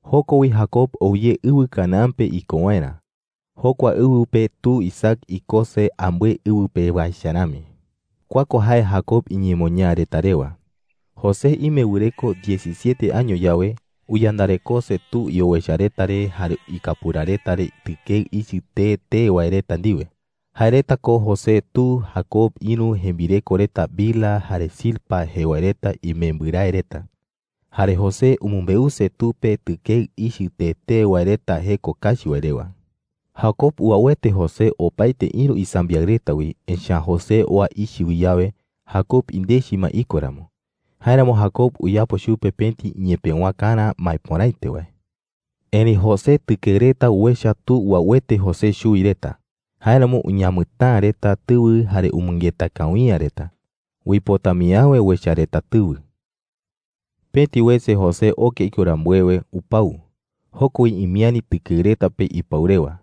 Joko wi Jacob ou ye ɨwɨ Canaán pe iko waerä. Jokua ɨwɨ pe tu Isaac ikose ambɨe ɨwɨ pewa echa rami. Kua ko jae Jacob iñemoñaa reta rewa: José ime wɨreko diecisiete año yawe, uyandarekose tu iowecha reta re jare ikapura reta re tɨkeɨ ichɨ tee tee wae reta ndiwe. Jae reta ko José tu Jacob ïru jembireko reta Bilha jare Zilpa jee wae reta imembɨrae reta. Jare José umɨmbeuse tu pe tɨkeɨ ichɨ tee tee wae reta jeko kachi wae rewa. Jacob uauete José opaete ïru isambiaɨ reta wi, echa’ä José oa ichɨ wi yawe, Jacob indechi ma iko ramo. Jáeramo Jacob uyapo chupe pëti iñepëwakarä maepöraete wae. Erëi José tɨkeɨ reta uecha tu uauete José chuwi reta. Jáeramo uñamɨtäa reta tɨwɨ jare umɨngeta kawi’ä reta. Uipota mii äwe uecha reta tɨwɨ. Pëti wese José oke iko rambuewe, upau. Joko wi imiäri tɨkeɨ reta pe ipau rewa.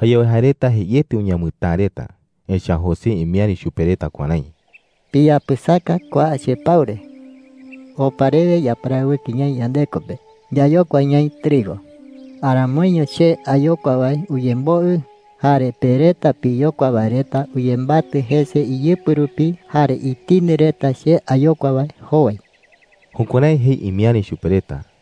Jayawe jae reta jeiete uñamɨtäa reta. Echa’ä José imiäri chupe reta kuärái: “Piyapɨsaka kua chepau re,” jei. “Opa rewe yaparawɨkɨ ñaï yandeko pe yayokua ñaï trigo. Aramoiño che ayokua wae uyemboɨ, jare pe reta piyokua wae reta uyembatɨ jese iyɨpɨ rupi jare itindɨ reta che ayokua wae jowai.” Jukuärái jei imiäri chupe reta.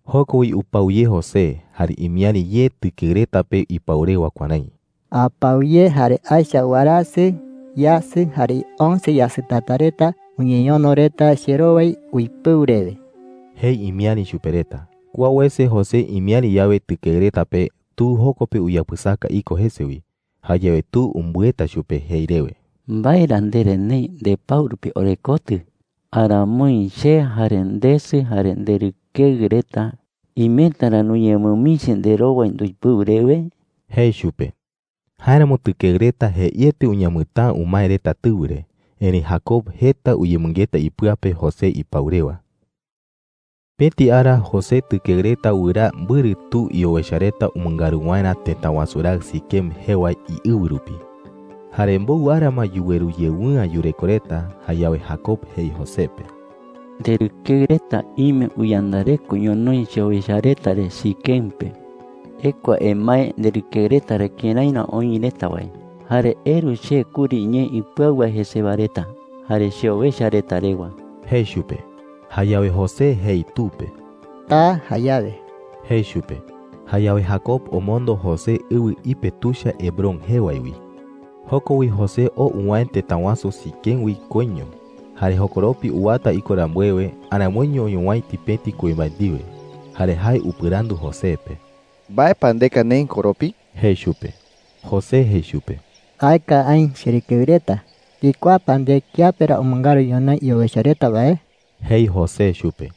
Joko wi upau ye José, jare imiäri ye tɨkeɨ reta pe ipau rewa kuärái: “Apau ye jare aecha warasɨ, yasɨ, jare once yasɨtata reta uñeñono reta cherowai uipɨu rewe,” jei imiäri chupe reta. Kua wese José imiäri yawe tɨkeɨ reta pe, tu joko pe uyapɨsaka iko jese wi. Jayawe tu umbɨeta chupe jei rewe: “¿Mbae ra ndere neï ndepau rupi orekotɨ? ¿Aramoi che, jare ndesɨ, jare nderɨkeɨ reta imeta ra nuñemɨmichi nderowai nduipɨu rewe?” jei chupe. Jáeramo tɨkeɨ reta jeiete uñamɨtäa umae reta tɨwɨ re. Erëi Jacob jeta uyemɨngeta ipɨa pe José ipau rewa. Pëti ara José tɨkeɨ reta wɨraa mbɨrɨ tu iowecha reta umɨngaru waerä tëta wasu raɨ Siquem jee wae iɨwɨ rupi. Jare mbowɨ ara ma yuweru yewɨ'ä yureko reta. Jayawe Jacob jei José pe: “Nderɨkeɨ reta ime uyandareko ñonoï cheowecha reta re Siquem pe,” jei. “Ekua emae nderɨkeɨ reta re kërái ra oï reta wae. Jare eru che kuri ñee ipɨau wae jesewa reta jare cheowecha reta rewa,” jei chupe. Jayawe José jei tu pe: “Taa jayawe,” jei chupe. Jayawe Jacob omondo José ɨwɨ ipe tuicha Hebrón jee wae wi. Joko wi José oo uwäe tëta wasu Siquem wi koiño. Jare jokoropi uwata iko rambuewe, aramoiño oñowäiti pëti kuimbae ndiwe. Jare jae upɨrandu José pe: “¿Mbae pa ndeka neï koropi?” jei chupe. José jei chupe: “Aeka aï cherɨkeɨ reta. ¿Ndikuaa pa nde kiape ra umɨngaru ñonoï iowecha reta wae?” jei José chupe.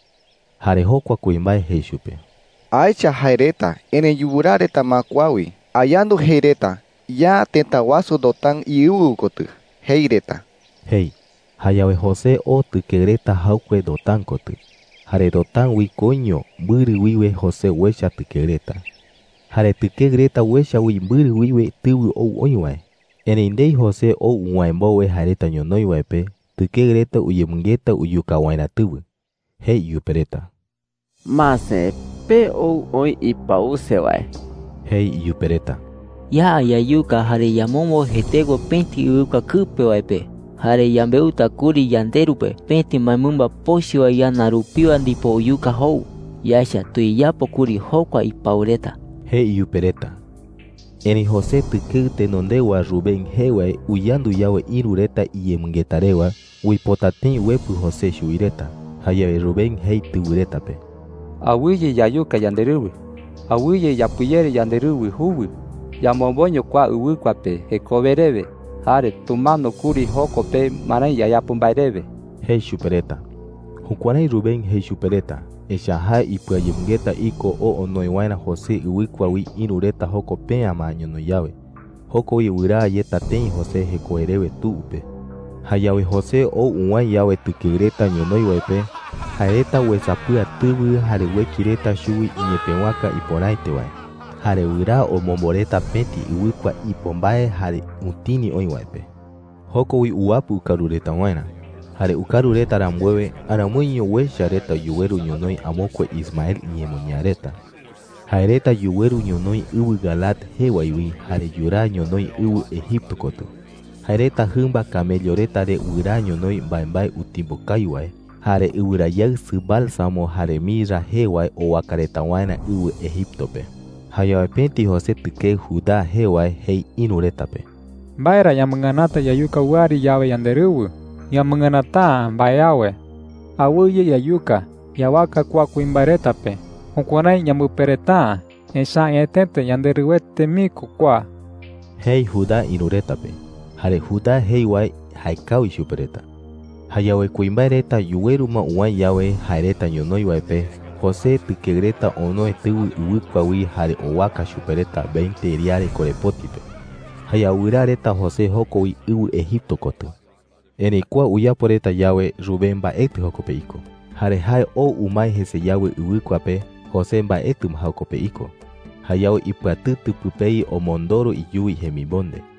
Jare jokua kuimbae jei chupe: “Aecha jae reta, erëi yuraa reta ma kua wi. Ayandu jei reta, ‘Ya tëta wasu Dotán iɨwɨ kotɨ,’ jei reta,” jei. Jayawe José oo tɨkeɨ reta jaɨkue Dotán kotɨ. Jare Dotán wi koiño, mbɨrɨ wiwe José uecha tɨkeɨ reta. Jare tɨkeɨ reta uecha wi mbɨrɨ wiwe tɨwɨ ou oï wae. Erëi ndei José ou uwäe mbowe jae reta ñonoï wae pe, tɨkeɨ reta uyemɨngeta uyuka waerä tɨwɨ. Jei iyupe reta: “Mase, pe ou oï ipause wae,” jei iyupe reta. “Ya yayuka jare yamombo jetekue pëti ɨwɨkua kɨpe wae pe. Jare yambeuta kuri yanderu pe pëti mbaemɨmba pochɨ wae ñana rupiwa ndipo uyuka jou. Yaecha tuyeyapo kuri jokua ipau reta,” jei iyupe reta. Erëi José tɨkeɨ tenondewa Rubén jee wae uyandu yawe ïru reta iyemɨngeta rewa, uipota tëi uepɨ José chuwi reta. Jayawe Rubén jei tɨwɨ reta pe: “Awɨye yayuka yanderɨwɨ,” jei. “Awɨye yapɨyere yanderɨwɨ juwɨ. Yamomboño kua ɨwɨkua pe jekowe rewe, jare tumano kuri joko pe marái yayapo mbae rewe,” jei chupe reta. Jukuärái Rubén jei chupe reta, echa’ä jae ipɨayemɨngeta iko oo onoe waerä José ɨwɨkua wi ïru reta joko pe’ä ma ñonoï yawe. Joko wi wɨraa yeta tëi José jekowe rewe tu pe. Jayawe José ou uwäe yawe tɨkeɨ reta ñonoï wae pe, jae reta uesapɨa tɨwɨ jare ueki reta chuwi iñepëwaka ipöraete wae. Jare wɨraa omombo reta pëti ɨwɨkua ipo mbae jare utini oï wae pe. Joko wi uwapɨ ukaru reta waerä. Jare ukaru reta rambuewe, aramoiño uecha reta yuweru ñonoï amokue Ismael iñemoñaa reta. Jae reta yuweru ñonoï ɨwɨ Galaad jee wae wi jare yuraa ñonoï ɨwɨ Egipto kotɨ. Jae reta jɨmba camello reta re wɨraa ñonoï mbaembae utimbo kawi wae, jare ɨwɨrayaɨsɨ bálsamo jare mirra jee wae owaka reta waerä ɨwɨ Egipto pe. Jayawe pëti José tɨkeɨ Judá jee wae jei ïru reta pe: “¿Mbae ra yamɨnganata yayuka wɨari yawe yanderɨwɨ?” jei. “Yamɨnganata’ä mbae awe. Awɨye yayuka. Yawaka kua kuimbae reta pe. Jukuärái yambɨpereta’ä, echa’ä añetete yanderɨwɨete mii ko kua,” jei Judá ïru reta pe. Jare Judá jei wae jaekawi chupe reta. Jayawe kuimbae reta yuweru ma uwäe yawe jae reta ñonoï wae pe, José tɨkeɨ reta onoe tɨwɨ ɨwɨkua wi jare owaka chupe reta veinte riare korepoti pe. Jayawe wɨraa reta José joko wi ɨwɨ Egipto kotɨ. Erëi kua uyapo reta yawe, Rubén mbaetɨ joko pe iko. Jare jae ou umae jese yawe ɨwɨkua pe, José mbaetɨ ma joko pe iko. Jayawe ipɨatɨtɨ pɨpei omondoro iyuwi jemimonde.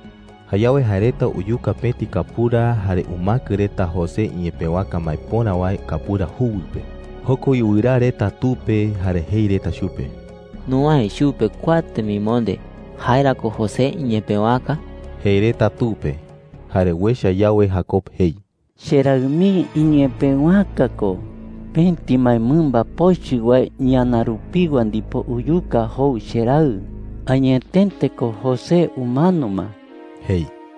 Jayawe jae reta uyuka pëti kapura jare umäkɨ reta José iñepëwaka maepöra wae kapura juwɨ pe. Joko wi wɨraa reta tu pe, jare jei reta chupe: “Nuwäe chupe kua temimonde. ¿Jae ra ko José iñepëwaka?” jei reta tu pe. Jare uecha yawe, Jacob jei: “¡Cheraɨ mii iñepëwaka ko! Pëti mbaemɨmba pochɨ wae ñana rupiwa ndipo uyuka jou cheraɨ. Añetete ko, José umano ma,” jei.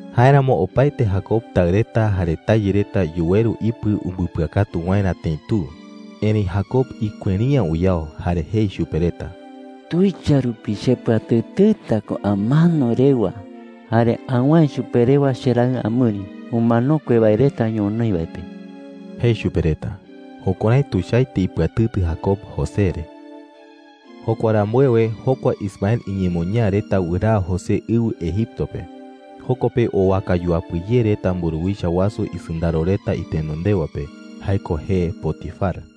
Jáeramo opaete Jacob taɨ reta jare tayɨ reta yuweru ipɨ umbɨpɨakatu waerä tëi tu. Erëi Jacob ikueri’ä uyao, jare jei chupe reta: “Tuicha rupi chepɨatɨtɨta ko amano rewa jare awäe chupe rewa cheraɨ amɨri umanokue wae reta ñonoï wae pe,” jei chupe reta. Jukuärái tuichaete ipɨatɨtɨ Jacob José re. Jokua rambuewe, jokua Ismael iñemoñaa reta wɨraa José ɨwɨ Egipto pe. Joko pe owaka yuapɨ ye reta mburuwicha wasu isɨndaro reta itenondewa pe. Jae ko jee Potifar.